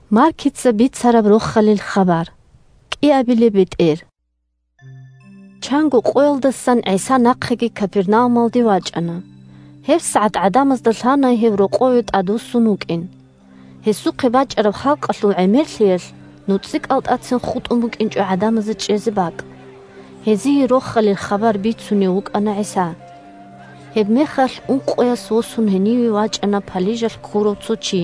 бетӀер ГӀисаца сахлъизавула палижалъ ккурав чи 1Чанго къоялдасан ГӀиса нахъеги Капернаумалде вачӀана. ГьебсагӀат гӀадамазда лъана гьев рокъове тӀадвуссун вукӀин. 2Гьесухъе бачӀараб халкъалъул гӀемерлъиялъ нуцӀикӀалтӀацин хутӀун букӀинчӀо гӀадамазе чӀезе бакӀ. Гьезие Рохалил хабар бицунев вукӀана ГӀиса. Гьебмехалъ ункъояс восун гьениве вачӀана палижалъ ккурав цо чи.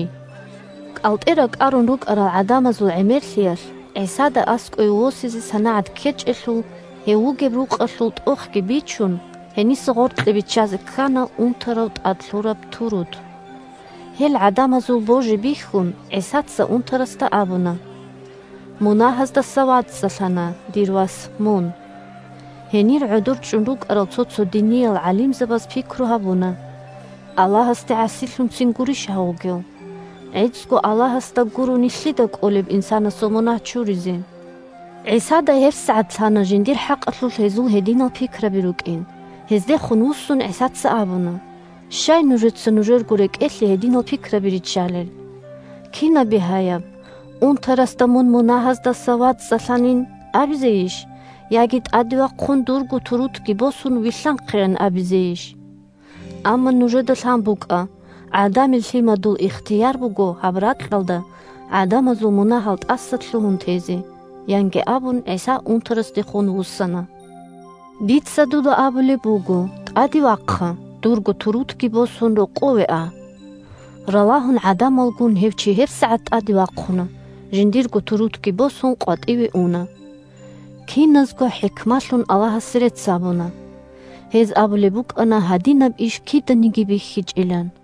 КӀалтӀе ракӀарун рукӀарал гӀадамазул гӀемерлъиялъ ГӀисада аскӀове восизе санагӀат ккечӀелъул, гьев вугеб рукъалъул тӀохги бичун, гьениса гъоркье биччазе ккана унтарав тӀад лъураб турут. Гьел гӀадамазул божи бихьун, ГӀисаца унтарасда абуна: – Мунагьаздаса вацӀцӀалъана, дир вас, мун! Гьенир гӀодор чӀун рукӀарал цо-цо диниял гӀалимзабаз пикру гьабуна: «Аллагьасде гӀасилъунцин гурищ гьав вугев? ГӀицӀго Аллагьасда гурони, лъида кӀолеб инсанасул мунагь чуризе?» ГӀисада гьебсагӀат лъана жиндир хӀакъалъулъ гьезул гьединал пикраби рукӀин. Гьездехун вуссун, ГӀисаца абуна: – Щай нужеца нужерго рекӀелъе гьединал пикраби риччалел? Кинаб бигьаяб: унтарасда «Мун мунагьаздаса вацӀцӀалъанилан» абизейищ, яги «ТӀаде вахъун, дурго турутги босун, вилълъанхъейилан» абизейищ? Амма нужеда лъан букӀа: ГӀадамил Лъимадул ихтияр буго гьаб ракьалда гӀадамазул мунагьал тӀасалъугьун тезе, – янги абун, ГӀиса унтарасдехун вуссана: – Дица дуда абулеб буго: тӀаде вахъа, дурго турутги босун, рокъове а! Ралагьун гӀадамалгун гьев чи гьебсагӀат тӀаде вахъуна, жиндирго турутги босун, къватӀиве уна. Киназго хӀикмалъун Аллагьасе рецц гьабуна. Гьез абулеб букӀана гьадинаб иш киданиги бихьичӀилан.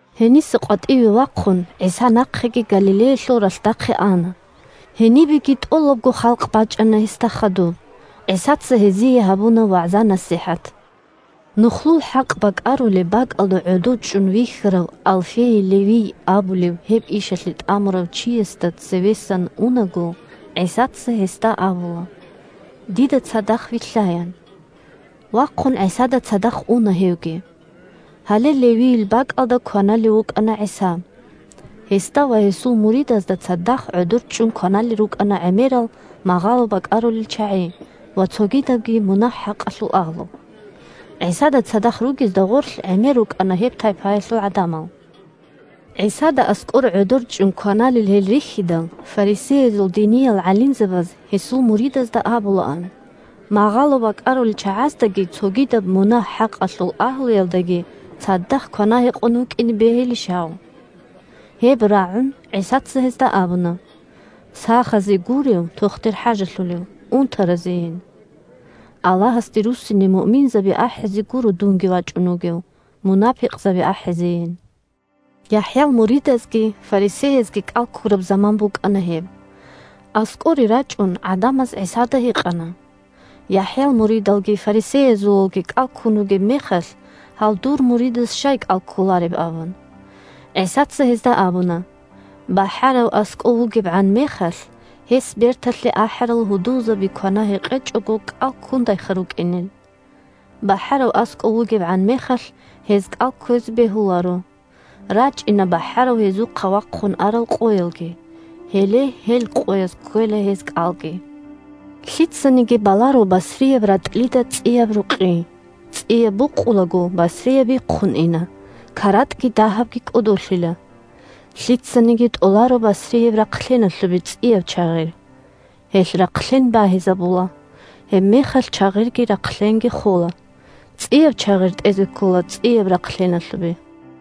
Гьениса къватӀиве вахъун, ГӀиса нахъеги Галилеялъул ралъдахъе ана. Гьенибеги тӀолабго халкъ бачӀана гьесда хадуб. ГӀисаца гьезиеги гьабуна вагӀза-насихӀат. Нухлул хӀакъ бакӀарулеб бакӀалда гӀодов чӀун вихьарав Алфейил Левий абулев гьеб ишалъе тӀамурав чиясда цевесан унаго, ГӀисаца гьесда абула: – Дида цадахъ вилълъа, – ян. Вахъун ГӀисада цадахъ уна гьевги. Гьале Левийил бакӀалда кваналев вукӀана ГӀиса. Гьесда ва гьесул муридазда цадахъ гӀодор чӀун кваналел рукӀана гӀемерал магъало бакӀарулел чагӀи ва цогидабги мунагь-хӀакъалъул агьлу. ГӀисада цадахъ ругезда гъорлъ гӀемер рукӀана гьеб тайпаялъул гӀадамал. ГӀисада аскӀор гӀодор чӀун кваналел гьел рихьидал, фарисеязул диниял гӀалимзабаз гьесул муридазда абулаан: – Магъало бакӀарулел чагӀаздаги цогидаб мунагь-хӀакъалъул агьлуялдаги цадахъ квана-гьекъон вукӀине бегьилищ гьав? Гьеб рагӀун, ГӀисаца гьезда абуна: – Сахазе гурев тохтир хӀажалъулев, унтаразейин. Аллагьасде руссине муъминзаби ахӀизе гуро дунги вачӀун вугев, мунапикъзаби ахӀизейин. ЯхӀял муридазги фарисеязги кӀал ккураб заман букӀана гьеб. АскӀоре рачӀун гӀадамаз ГӀисада гьикъана: – ЯхӀял муридалги фарисеязулалги кӀал ккун ругеб мехалъ, гьал дур муридаз щай кӀал кколареб? – абун. ГӀисаца гьезда абуна: – БахӀарав аскӀов вугебгӀан мехалъ, гьес берталъе ахӀарал гьудулзаби квана-гьекъечӀого кӀал ккундайха рукӀинел? БахӀарав аскӀов вугебгӀан мехалъ гьез кӀал кквезе бегьуларо. РачӀина бахӀарав гьезухъа вахъун арал къоялги, гьеле гьел къояз кквела гьез кӀалги. Лъицаниги баларо басрияб ратӀлида цӀияб рукъи: цӀияб букъулаго басрияб бихъун ина, каратӀги дагьабги кӀодолъила. Лъицаниги тӀоларо басрияб рахълъеналъубе цӀияб чагъирги. Гьелъ рахълъен багьизабула, гьебмехалъ чагъирги рахълъенги хола. ЦӀияб чагъир тӀезе ккола цӀияб рахълъеналъубе.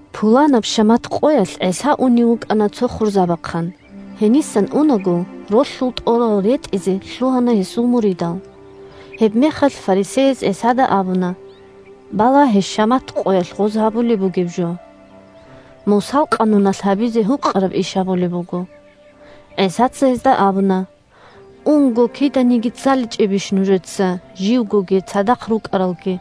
Пуланаб шамат къоялъ ГӀиса унев вукӀана цо хурзабахъан. Гьенисан унаго, ролъул тӀорал ретӀизе лъугьана гьесул муридал. Гьебмехалъ фарисеяз ГӀисада абуна: – Балагье шамат къоялъ гъоз гьабулеб бугеб жо: Мусал къануналъ гьабизе гьукъараб иш гьабулеб буго. ГӀисаца гьезда абуна: – Унго, киданиги цӀаличӀебищ нужеца, живгоги цадахъ рукӀаралги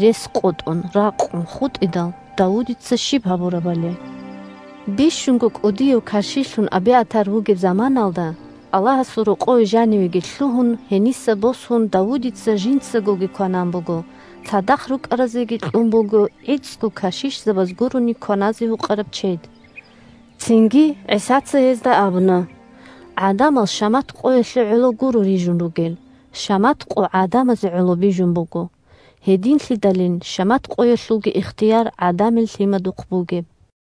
рес къотӀун, ракъун хутӀидал, Давудица щиб гьабурабали? Бищунго кӀудияв кашишлъун Абиатар вугеб заманаялда, Аллагьасул рокъове жанивеги лъугьун, гьениса босун Давудица жинцагоги кванан буго, цадахъ рукӀаразеги кьун буго гӀицӀго кашишзабаз гурони кваназе гьукъараб чед. Цинги ГӀисаца гьезда абуна: – ГӀадамал шамат къоялъе гӀоло гуро рижун ругел, шамат къо гӀадамазе гӀоло бижун буго. Гьединлъидалин шамат къоялъулги ихтияр ГӀадамил Лъимадухъ бугеб.